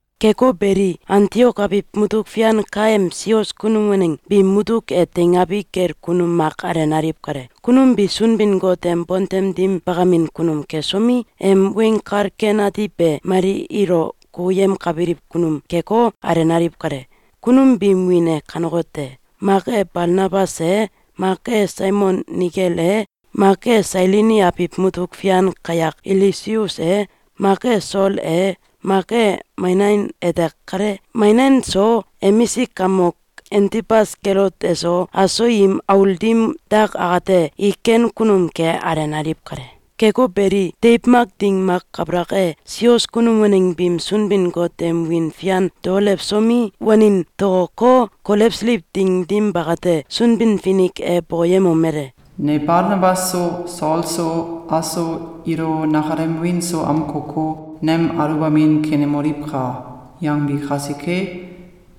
Keko beli, Antiok abiw mutuk fian kaem sios kunum waneng biim mutuk e teingabi kel kunum mak alenaliw kale. Kunum bi Sunbin-Got em bontem dim bakamin kunum kesomi, em Weng Kal Ken Ati be mali ilo kukuyemkabiliw kunum keko, alenaliw kale. Kunum biim wiin e kanekote: mak e Balnabas e, mak e Simeon Nigel e, mak e Sailini abiw mutuk fian kayak Ilusius e, mak e Sol e, mak e Manain ete kale. Manain so, emisik kamok Antibas Kelot eso, aso im aul dim dak akate, i ken kunum ke alenaliw kale. Keko beli, deiw mak ding mak kabalak e, sios kunum waneng biim Sunbin-Got em wiin fian daolewsomi, wanin tokoko, kolewsiliw ding dim bakate, Sunbin-Finik e bokoyemomele: “Ne Balnabas so, Sol so, aso ilo nakalem wiin so amkoko, ‘Nem aluwbamin kenemoliwka!’, yangbi kasike,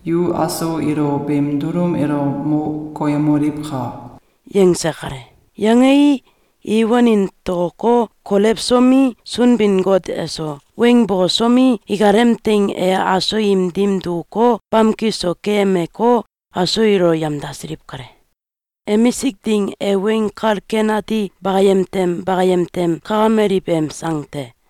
yu aso ilo beem dulum elo mo koyemoliwka!”, yangse kale. Yangei, i wanin tokoko, kolewsomi, Sunbin-Got eso weng bokosomi, ikalem teing e aso im dim dukuko, bamki so keyemeko, aso ilo yamdasiliw kale. Emisik Ding e Weng Kal Ken Ati Bakayem Tem Bakayem Tem Kakamaliw em Sang te.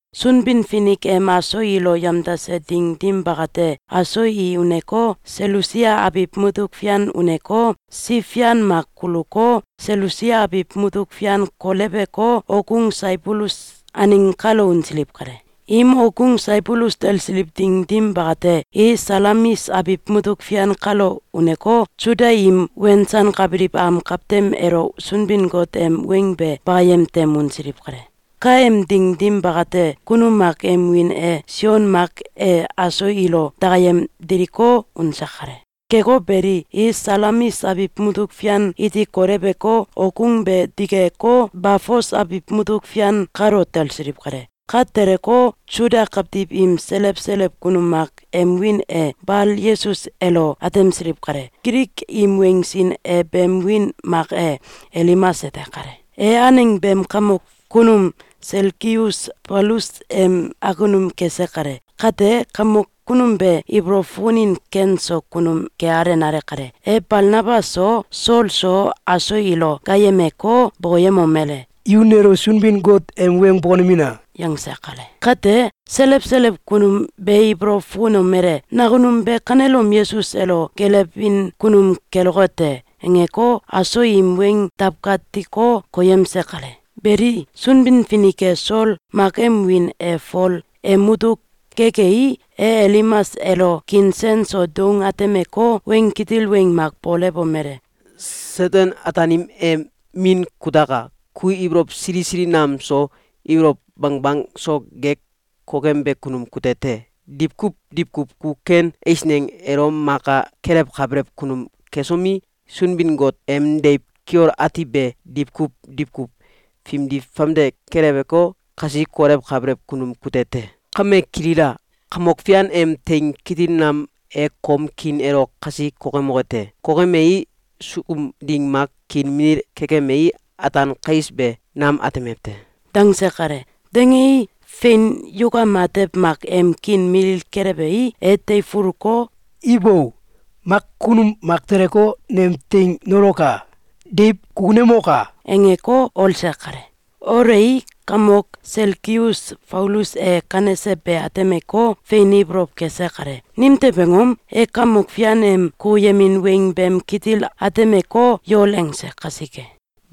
Sunbin-Finik em aso ilo yamdase ding dim bakate, aso i uneko, Selusia abiw mutuk fian uneko, siw fian mak kuluko, Selusia abiw mutuk fian koleweko, okgung Saibulus aneng kalo unsiliw kale. Im okgung Saibulus talsiliw ding dim bakate, i Salamis abiw mutuk fian kalo uneko, Suda im wensankabiliw am kawtem elo Sunbin-Got em weng be bakayem tem unsiliw kale. (Kaem ding dim bakate, kunum mak em wiin e Sion Mak e aso ilo dakayem diliko, unse kale.) Keko beli, i Salamis abiw mutuk fian iti koleweko, okgung be digeko, Bafos abiw mutuk fian kalo talsiliw kale. Ka teleko, Suda kawtiw im selew selew kunum mak em wiin e Bal-Yesus elo atemsiliw kale. Gilik im weng sin e beem wiin mak e Elimas ete kale. E aneng beem kamok kunum Selgius Faulus em akunum kese kale. Kate, kamok kunum be ibolow fukunin ken so kunum ke alenale kale. E Balnabas so, Sol so, aso ilo gaayemeko, bokoyemomele: “Yu nelo Sunbin-Got em weng bokonemina!”, yangse kale. Kate, selew selew kunum be ibolow fukunomele: “Nakunum be kanelom Yesus elo gelewin kunum keloke te!”, angeko, aso im weng dawkatiko, koyemse kale. Beli, Sunbin-Finik e Sol (mak em wiin e Fol) em mutuk gekei, e Elimas elo kiin sen so doung atemeko, weng kitil weng mak bokolewomele: “Seten-Ataanim em min kutaka! Ku ibolow sili sili nam so, ibolow bangbang so gek kokembe kunum kute te. Diwkuw diwkuw ku ken eisneng elo maka kelewkabelew kunum kesomi, Sunbin-Got em deiw kiol ati be diwkuw diwkuw fimdi famde keleweko, kasi kolewkabelew kunum kute te. Kame kilila! Kamok Fian em teing kitil nam e kom kiin elo kasi kokemoke te. Kokemei, sukum ding mak kiin milil kekemei, ataan kais be nam atemew te!”, dangse kale. Dangei, fein, yukam atew mak em kiin milil kelewei, e teifuluko, “Ibo! Mak kunum mak teleko, nem teing nauleko, deiw kukunemoka!”, angeko, olse kale. Olei, kamok Selgius Faulus e kanese be atemeko, fein ibolow kese kale. Nimtew angom? E Kamok Fian em kukuyemin weng beem kitil atemeko, yol angse kasike.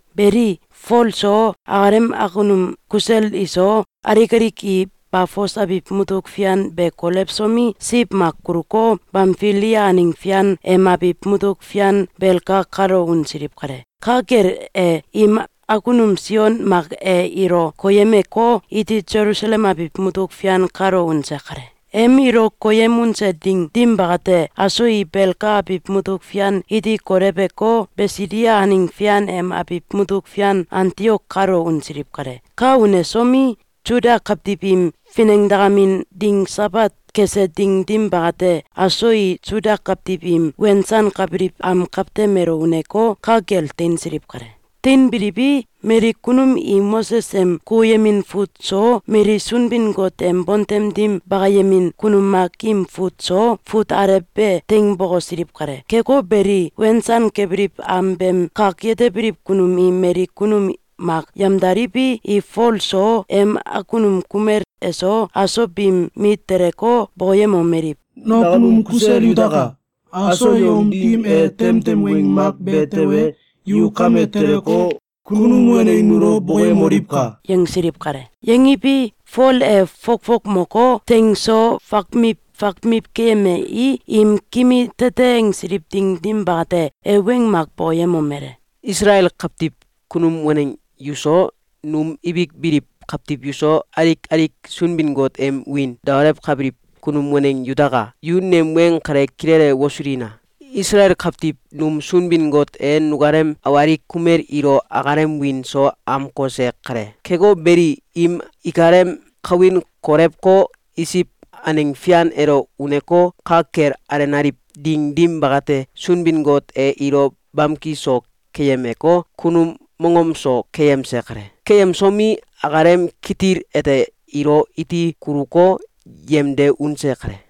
Beli, Fol so, akalem akunum kusel iso, alik alik i Bafos abiw mutuk fian be kolewsomi, siw mak kuluko, Bamfilia aneng fian em abiw mutuk fian Belga kalo unsiliw kale. Ka kel e, im akunum Sion Mak e ilo koyemeko, iti Selusalem abiw mutuk fian kalo unse kale. Em ilo koyem unse ding dim bakate, aso i Belga abiw mutuk fian iti koleweko, Bisidia aneng fian em abiw mutuk fian Antiok kalo unsiliw kale. Ka unesomi, Suda kawtiw im finengdakamin ding Sabat kese ding dim bakate, aso i Suda kawtiw im wensankabiliw am kawtem elo uneko, ka kel teinsiliw kale. Teinbiliwi, mali kunum i Moses em kukuyemin fut so, mali Sunbin-Got em bontem dim bakayemin kunum mak im fut so, fut alew be teing bokosiliw kale. Keko beli, wensankabiliw am beem kak yetebiliw kunum i mali kunum mak yamdaliwi, i Fol so, em akunum kumel eso, aso biim mit teleko, bokoyemomeliw: “Nakunum kusel yutaka! Aso yom dim e temtem weng mak be tewe, yu kame teleko, kunum waneng nulo bokoyemoliwka!”, yangsiliw kale. Yangiwi, Fol e fokfok moko, teing so fakmiw fakmiw keyemei, im kimi tete angsiliw ding dim bakate, e weng mak bokoyemomele: “Isalael kawtiw kunum waneng yuso, num ibik biliw kawtiw yuso, alik alik Sunbin-Got em wiin daolewkabiliw kunum waneng yutaka! Yu nem weng kale kilele wosulina! Isalael kawtiw num Sunbin-Got e nukalem awalik kumel ilo akalem wiin so amkose kale. Keko beli, im ikalem kawin kolewko, Isiw aneng fian elo uneko, ka kel alenaliw ding dim bakate, Sunbin-Got e ilo bamki so keyemeko, kunum mongom so keyemse kale. Keyemsomi, akalem kitil ete ilo iti kuluko, yemde unse kale.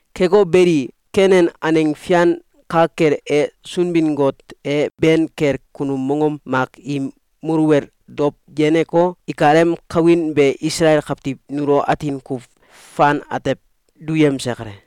Keko beli, Kenan aneng fian ka kel e, Sunbin-Got e ben kel kunum mongom mak im muluwel dow yeneko, ikalem kawin be Isalael kawtiw nulo atin kuw fan atew duyemse kale.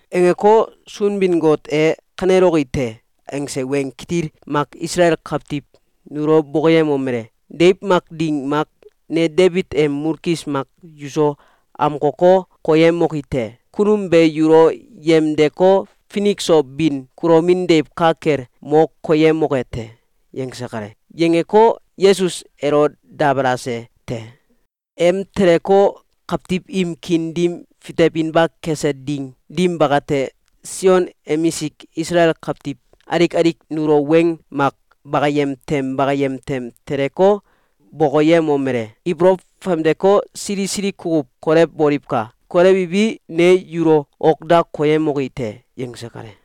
Angeko, Sunbin-Got e ‘Kaneloki te!’, angse weng kitil mak Isalael kawtiw nulo bokoyemomele: ‘Deiw mak ding mak, ne Debit em mulkis mak yuso amkoko, koyemoki te. Kunum be yulo yemdeko, finik so bin kulomin deiw ka kel mo koyemoke te.’, yangse kale. Yangeko, Yesus elo dabalase te. Em teleko, kawtiw im kiin dim fitewinba kese ding dim bakate, Sion emisik Isalael kawtiw alik alik nulo weng mak bakayem tem bakayem tem teleko, bokoyemomele: ‘Ibolow famdeko, sili sili kukuw kolewboliwka! Kolewiwi, ne yulo ok da koyemoki te!’, yangse kale.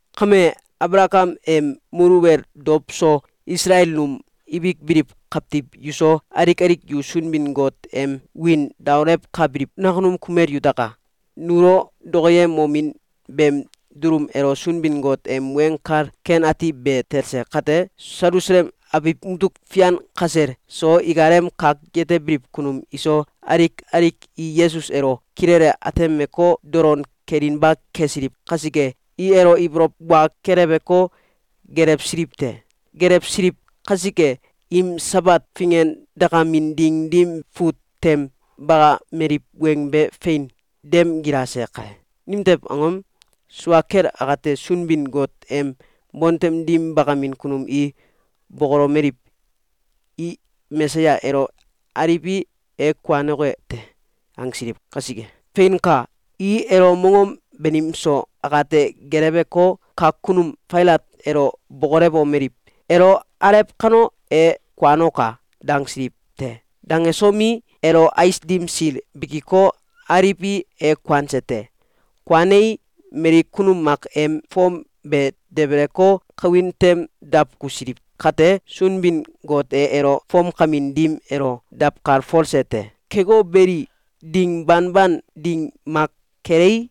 Kame, Abalakam em muluwel dow so, Isalel num ibik biliw kawtiw yuso, alik alik yu Sunbin-Got em wiin daolewkabiliw nakunum kumel yutaka! Nulo dokoyemomin beem dulum elo Sunbin-Got em Weng Kal Ken Ati be talse kate, Selusalem abiw mutuk fian kasel so, ikalem kak yetebiliw kunum iso, alik alik i Yesus elo kilele atemeko, dolon kelinba kesiliw kasike, i elo ibolow wa keleweko, geelewsiliw te. Geelewsiliw kasike, im Sabat fingendakamin ding dim fut tem bakameliw weng be fein dem gilase kale. Nimtew angom? Sua kel akate, Sunbin-Got em bontem dim bakamin kunum i bokolomeliw: ‘I Mesaya elo aliwi, e kuanoke te!’, angsiliw kasike. Feinka! I elo mongom banim so akate geeleweko, kak kunum Failat elo bokolewomeliw: ‘Elo alew kano, e kuanoka!’, dangsiliw te. Dangesomi, elo ais dim sil bikiko, aliwi, e kuanse te. Kuanei, mali kunum mak em fom be debeleko, kawin tem dawkusiliw kate, Sunbin-Got e elo fomkamin dim elo dawkalfolse te. Keko beli, ding banban ding mak kelei,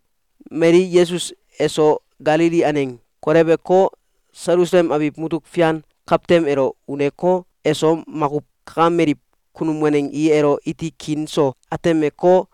mali Yesus eso Galili aneng koleweko, Selusalem abiw mutuk fian kawtem elo uneko, eso makuw kakameliw kunum waneng i elo iti kiin so atemeko,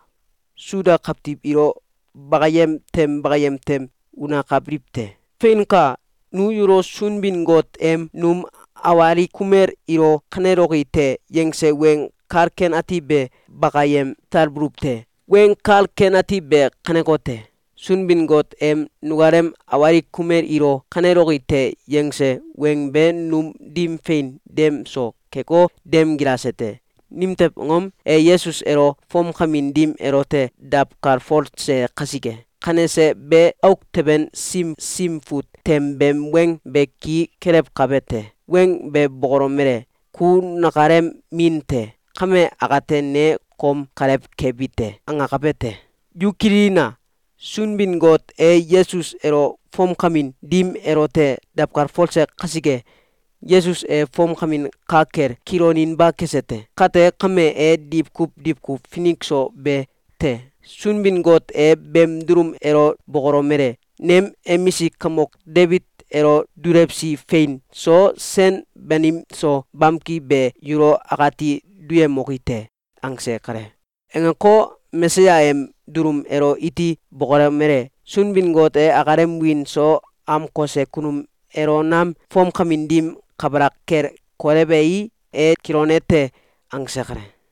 Suda kawtiw ilo bakayem tem bakayem tem unakabiliw te. Feinka! Nu yulo Sunbin-Got em num awalik kumel ilo ‘Kaneloki te!’, yangse Weng Kal Ken Ati be bakayem talbuluw te. Weng Kal Ken Ati be kanekote: Sunbin-Got em nukalem awalik kumel ilo ‘Kaneloki te!’, yangse weng be num dim fein dem so keko, dem gilase te. Nimtew angom? E Yesus elo fomkamin dim elote dawkalfolse kasike. Kanese be, auk teben sim Sim Fut tem beem weng be ki kelewkabe te. Weng be bokolomele: ‘Ku nakalem min te. Kame akate, ne kom kalew kebi te.’, angakabe te. Yu kililina! Sunbin-Got e Yesus elo fomkamin dim elote dawkalfolse kasike, Yesus e fomkamin ka kel kiloninba kese te. Kate kame, e diwkuw diwkuw finik so be te. Sunbin-Got e beem dulum elo bokolomele: ‘Nem emisik kamok Debit elo dulewsi fein so, sen banim so, bamki be yulo akati duyemoki te.’, angse kale. Angeko, Mesaya em dulum elo iti bokolomele: ‘Sunbin-Got e akalem wiin so amkose kunum elo nam fomkamin dim kabalak kel kolewei, e kilone te.’, angse kale.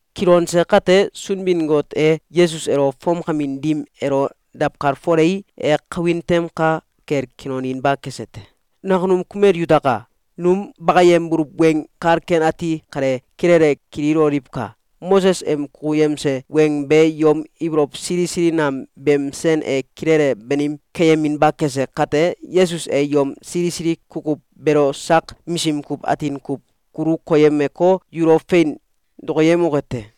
Kilonse kate, Sunbin-Got e Yesus elo fomkamin dim elo dawkalfolei, e kawin tem ka kel kiloninba kese te. Nakunum kumel yutaka! Num bakayembuluw Weng Kal Ken Ati kale kilele kililoliwka! Moses em kukuyemse weng be yom ibolow sili sili nam beem sen e kilele banim keyeminba kese kate, Yesus e yom sili sili kukuw beelo sak misim kuw atin kuw kulu koyemeko, yulo fein dokoyemoke te.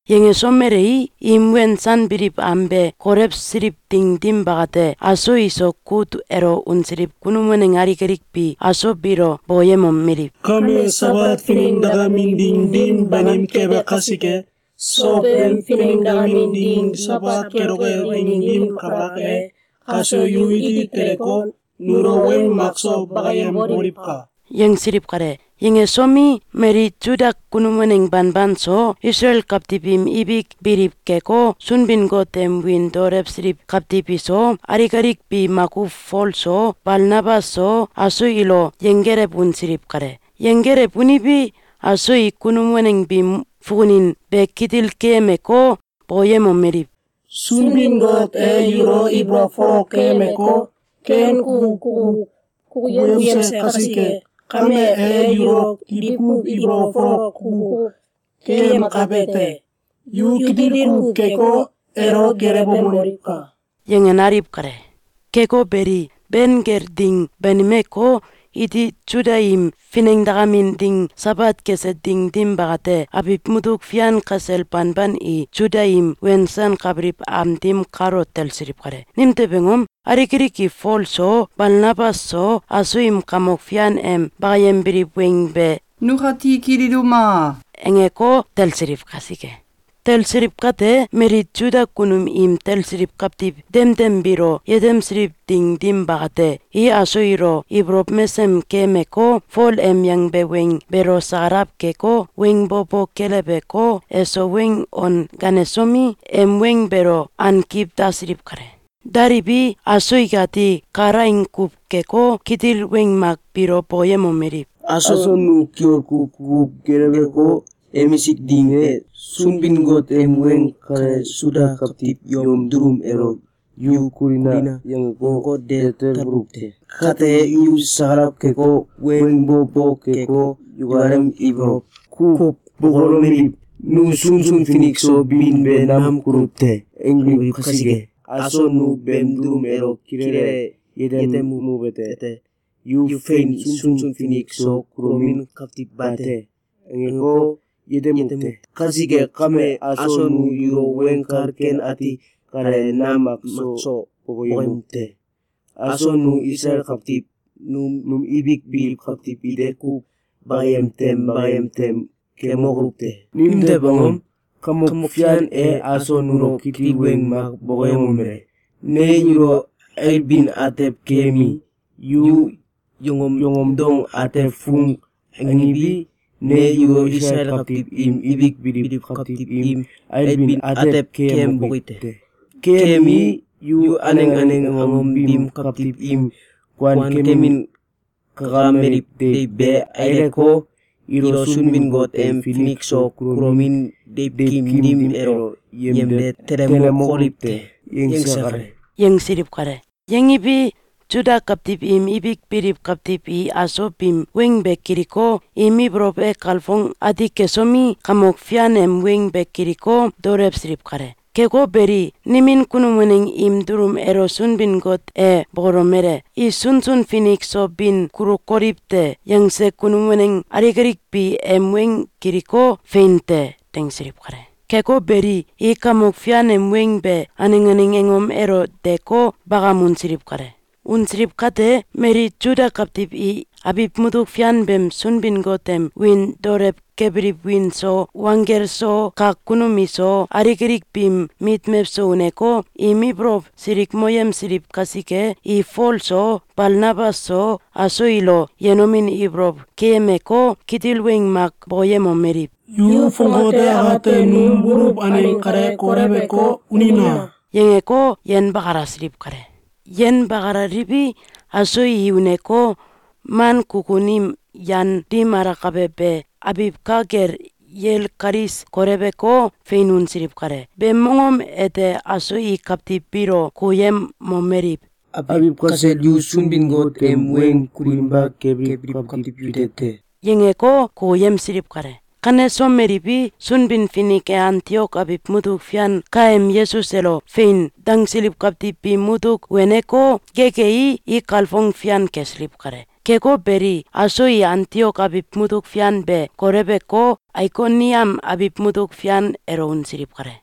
Yangesomelei, im wensanbiliw am be kolewsiliw ding dim bakate, aso iso kut elo unsiliw kunum waneng alik alik bi aso biilo bokoyemomeliw: “Kame Sabat finengadakamin ding dim banim kembe kasike, sowem finengdakamin ding Sabat keloke ding dim kabalak e, kaso yu iti teleko, nulo weng makso bakayemboliwka!”, yangsiliw kale. Yangesomi, mali Suda kunum waneng banban so, Isalael kawtiw im ibik biliw keko, Sunbin-Got em wiin daolewsiliw kawtiw iso, alik alik bi makuw Fol so, Balnabas so, aso ilo yenggelew unsiliw kale. Yenggelew uniwi, aso i kunum waneng biim fukunin be kitil keyemeko, bokoyemomeliw: “Sunbin-Got e yulo ibolow folok keyemeko, ken kuw kukuw kukuyemse kasike kame, e yulo diwkuw ibolow folok kukuw keyemkabe te. Yu kitil kuw keko, elo gelewemoliwka!”, yanganaliw kale. Keko beli, ben kel ding banimeko, iti Suda im finengdakamin ding Sabat kese ding dim bakate, abiw mutuk fian kasel banban i Suda im wensankabiliw am dim kalo talsiliw kale. Nimtew angom? Alik alik i Fol so, Balnabas so, aso im Kamok Fian em bakayembiliw weng be “Nukati kililuma!”, angeko, talsiliw kasike. Talsiliw kate, mali Suda kunum im talsiliw kawtiw demdem biilo yetemsiliw ding dim bakate, i aso ilo ibolow mesem keyemeko, Fol em yangbe weng beelo sakalaw keko, weng bo bo keleweko, eso weng on ganesomi, em weng beelo ankiw dasiliw kale. Daliwi, aso ikati kalaing kuw keko, kitil weng mak biilo bokoyemomeliw: “Aso nu kiol kuw kukuw geleweko, emisik ding e, Sunbin-Got em weng kale Suda kawtiw yom dulum elo ‘Yu kulina!’, yangeko, de talbuluw te. Kate, yu sakalaw keko, weng bo bo keko, yukalem ibolow kuw bokolomeliw: ‘Nu sunsun finik so bin be nam kuluw te!’, angbiliw kasike, aso nu beem dulum elo kilele yetemuwete: ‘Yu fein sunsun finik so kulomin kawtiw bate!’, angeko, yetemuw te. Kasike kame, aso nu yulo Weng Kal Ken Ati kale nam makso bokoyemuw te. Aso nu Isalael kawtiw num ibik biliw kawtiw ite kuw bakayem tem bakayem tem kemokoluw te. Nimtew angom? Kamok Fian e aso nulo kitil weng mak bokoyemomele: ‘Ne yulo ailbin atew keyemii, yu yongom dong atew fung angiwi, ne yulo Isalael kawtiw im ibik biliw kawtiw im ailbin atew keyemboki te. Keyemii, yu aneng aneng angom biim kawtiw im kuankemin kakameliw deiw be aileko, ilo Sunbin-Got em finik so kulomin deiwkim dim elo yemde telemokoliw te.’, yangse kale.”, yangsiliw kale. Yangiwi, Suda kawtiw im ibik biliw kawtiw i aso biim weng be kiliko, im ibolow e kalfong ati kesomi, Kamok Fian em weng be kiliko, daolewsiliw kale. Keko beli, nimin kunum waneng im dulum elo Sunbin-Got e bokolomele: “I sunsun finik so bin kulukoliw te!”, yangse kunum waneng alik alik bi em weng kiliko, “Fein te!”, dangsiliw kale. Keko beli i Kamok Fian em weng be aneng aneng angom elo deko, bakam unsiliw kale. Unsilw kate, mali Suda kawtiw i abiw mutuk fian beem Sunbin-Got em wiin daolew kebiliw wiin so wanggel so, kak kunum iso, alik alik biim mit mewso uneko, im ibolow silikmoyemsiliw kasike, i Fol so, Balnabas so, aso ilo yenomin ibolow keyemeko, kitil weng mak bokoyemomeliw: “Yu fongate akate num buluw aneng kale koleweko, unina!”, yangeko, yenbakalasiliw kale. Yenbakalaliwi, aso i uneko, man kukun im yan dim alakabe be abiw ka kel yel kalis koleweko, fein unsiliw kale. Beem mongom ete aso i kawtiw biilo kukuyemomeliw: “Abiw kasel yu Sunbin-Got em weng kulinba kebiliw kawtiw yute te!”, yangeko, kukuyemsiliw kale. Kanesomeliwi, Sunbin-Finik e Antiok abiw mutuk fian kaem Yesus elo “Fein!”, dangsiliw kawtiw biim mutuk weneko, gekei, i kalfong fian kesiliw kale. Keko beli, aso i Antiok abiw mutuk fian be koleweko, Aikoniam abiw mutuk fian elo unsiliw kale.